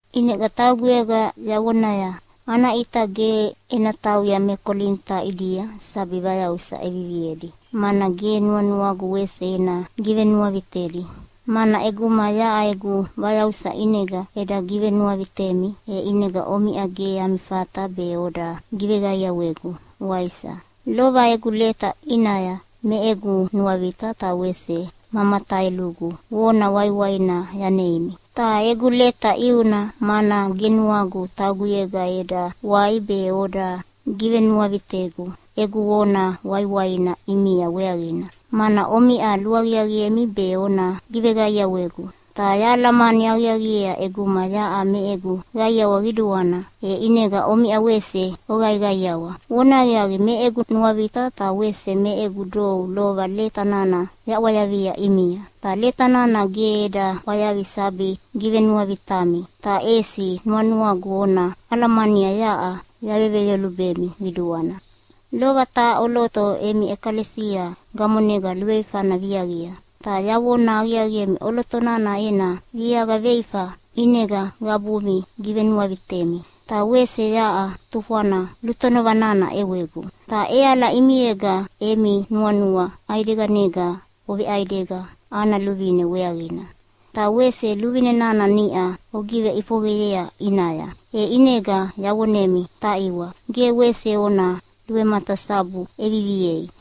ʼInega tauguyega yavonaya, “Ana ʼita ge ena tauya me Kolinita ʼidia sabi vayausa ʼeviviedi, mana ge nuanuagu wese ena givenuavitedi.” Mana ʼeguma yaʼa egu vayausa ʼinega eda givenuavitemi, e ʼinega omiʼa ge ami fata be oda giveqaiawegu, waisa? Lova egu leta ʼinaya me egu nuavita ta wese ma mataelugu vona waiwaina yaneimi. Ta egu leta ʼiuna, mana ge nuagu tauguyega eda wai be oda givenuavitegu egu vona waiwaina ʼimia weaqina, mana omiʼa luaqiaqiemi be ona giveqaiawegu. Ta yahalamani aqiaqiea ʼeguma yaʼa me egu qaiawa qiduana, e ʼinega omiʼa wese oqaiqaiawa. Vonahaqiaqi, me egu nuavita ta wese me egu dou lova leta nana yaʼwayavia ʼimia. Ta leta nana ge eda ʼwayavi sabi givenuavitami, ta ʼesi nuanuagu ona alamania yaʼa yaveveyolubemi qiduana. Lova taha ʼoloto emi ʼekalesia gamonega luveifana viaqia. Ta yavona aqiaqiemi ʼoloto nana ena viaqa veifa ʼinega qabumi givenuavitemi, ta wese yaʼa tufwana lutonova nana ʼewegu. Ta ʼeala ʼimiega emi nuanua ʼaideganega oveʼaidega ana luvine weaqina. Ta wese luvine nana niʼa ogiveʼifoqeyea ʼinaya, e ʼinega yavonemi, taʼiwa, ge wese ona luvematasabu ʼeviviei.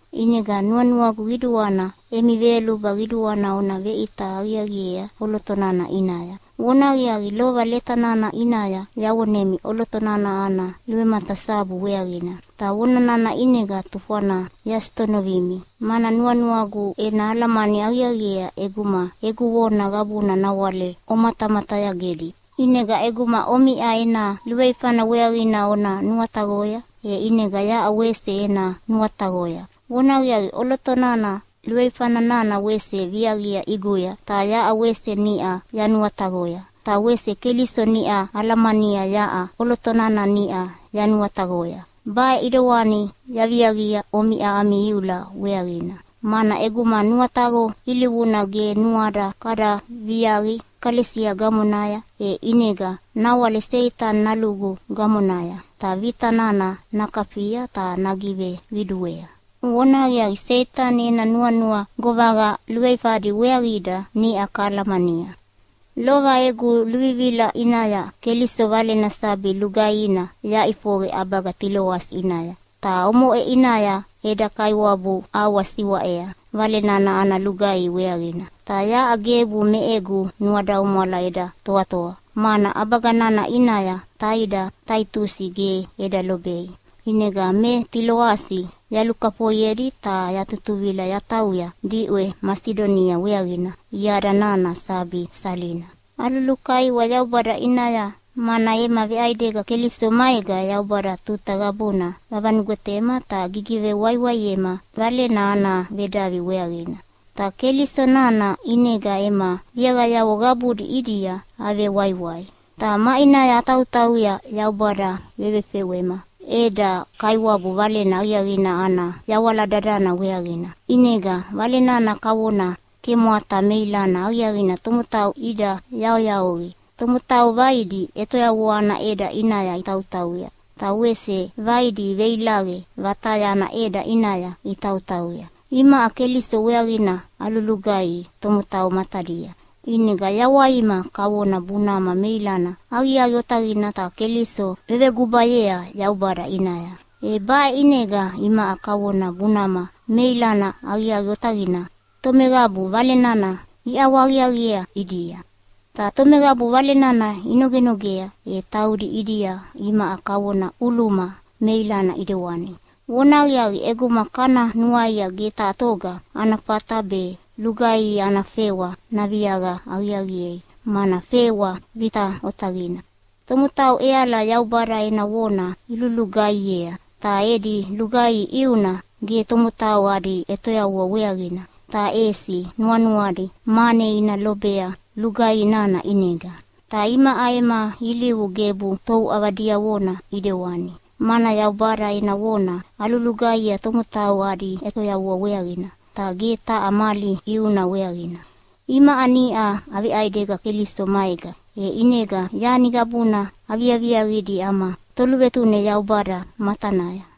ʼInega nuanuagu qiduana emi veyoluba qiduana ona veʼita aqiaqiea ʼoloto nana ʼinaya. Vonahaqiaqi, lova leta nana ʼinaya yavonemi ʼoloto nana ana luvematasabu weaqina. Ta vona nana ʼinega tufwana yasitonovimi, mana nuanuagu ena alamani aqiaqiea ʼeguma egu vona qabuna nawale omatamatayagedi. ʼInega ʼeguma omiʼa ena luveifana weaqina ona nuataqoya, e ʼinega yaʼa wese ena nuataqoya. Vonahaqiaqi, ʼoloto nana luveifa nana wese viaqia ʼiguya, ta yaʼa wese niʼa yanuataqoya. Ta wese Keliso niʼa alamania yaʼa ʼoloto nana niʼa yanuataqoya. Baʼe ʼidewani yaviaqia omiʼa ami iula weaqina, mana ʼeguma nuataqo ilivuna ge nuada kada viaqi ʼekalesia gamonaya, e ʼinega nawale Seitani nalugu gamonaya, ta vita nana nakafia ta nagiveqiduea. Vonahaqiaqi, Seitani ena nuanua govaqa luveifadi weaqida niʼa kahalamania. Lova egu luvivila ʼinaya Keliso Valena sabi lugaihina yaʼifoqe ʼabaga Tiloasi ʼinaya. Ta omoʼe ʼinaya eda Kaiwabu ʼawa siwaʼea Vale nana ana lugaihi weaqina. Ta yaʼa gebu me egu nuadaumwala eda toatoa, mana ʼabaga nana ʼinaya taida Taitusi ge eda lobei. ʼInega me Tiloasi yalukafoiedi ta yatutuvila yatauya diʼwe Masidonia weaqina iada nana sabi salina. Alulukaiwa Yaubada ʼinaya, mana ema veʼaidega Keliso maega Yaubada tuta qabuna vavanugwetema ta gigivewaiwaiema Valena ana vedavi weaqina. Ta Keliso nana ʼinega ema viaqayavo qabudi ʼidia avewaiwai. Ta maʼinaya atautauya Yaubada vevefewema eda Kaiwabu Valena Aqiaqina ana yawala dadana weaqina, ʼinega Vale nana kavona kemwata meilana aqiaqina tomotau ida yaoyaoqia. Tomotau vaidi ʼetoyavua ana ʼeda ʼinaya itautauya, ta wese vaidi veilaqe vataya ana ʼeda ʼinaya itautauya. Imaʼa Keliso weaqina alulugaihi tomotau matadia, ʼinega yawaima kavona bunama meilana aqiaqi otaqina ta Keliso vevegubayea Yaubada ʼinaya. E baʼe ʼinega imaʼa kavona bunama meilana aqiaqi otaqina tomeqabu Vale nana iʼawahaqiaqiea ʼidia. Ta tomeqabu Vale nana inogenogea, e taudi ʼidia imaʼa kavona ʼuluma meilana ʼidewani. Vonahaqiaqi, ʼeguma kana nuaia ge taha toga ana fata be lugaihi ana fewa naviaqa aqiaqiei, mana fewa vita otaqina. Tomotau ʼeala Yaubada ena vona ilulugaihiea, ta edi lugaihi ʼiuna ge tomotau adi ʼetoyavua weaqina, ta ʼesi nuanuadi mane ina lobea lugaihi nana ʼinega. Ta imaʼa ema ilivu gebu touʼava diavona ʼidewani, mana Yaubada ena vona alulugaihiea tomotau adi ʼetoyavua weaqina, ta ge taha mali ʼiuna weaqina. Imaʼa niʼa aveʼaidega Keliso maega, e ʼinega yani qabuna aviaviaqidi ama Toluvetune Yaubada matanaya.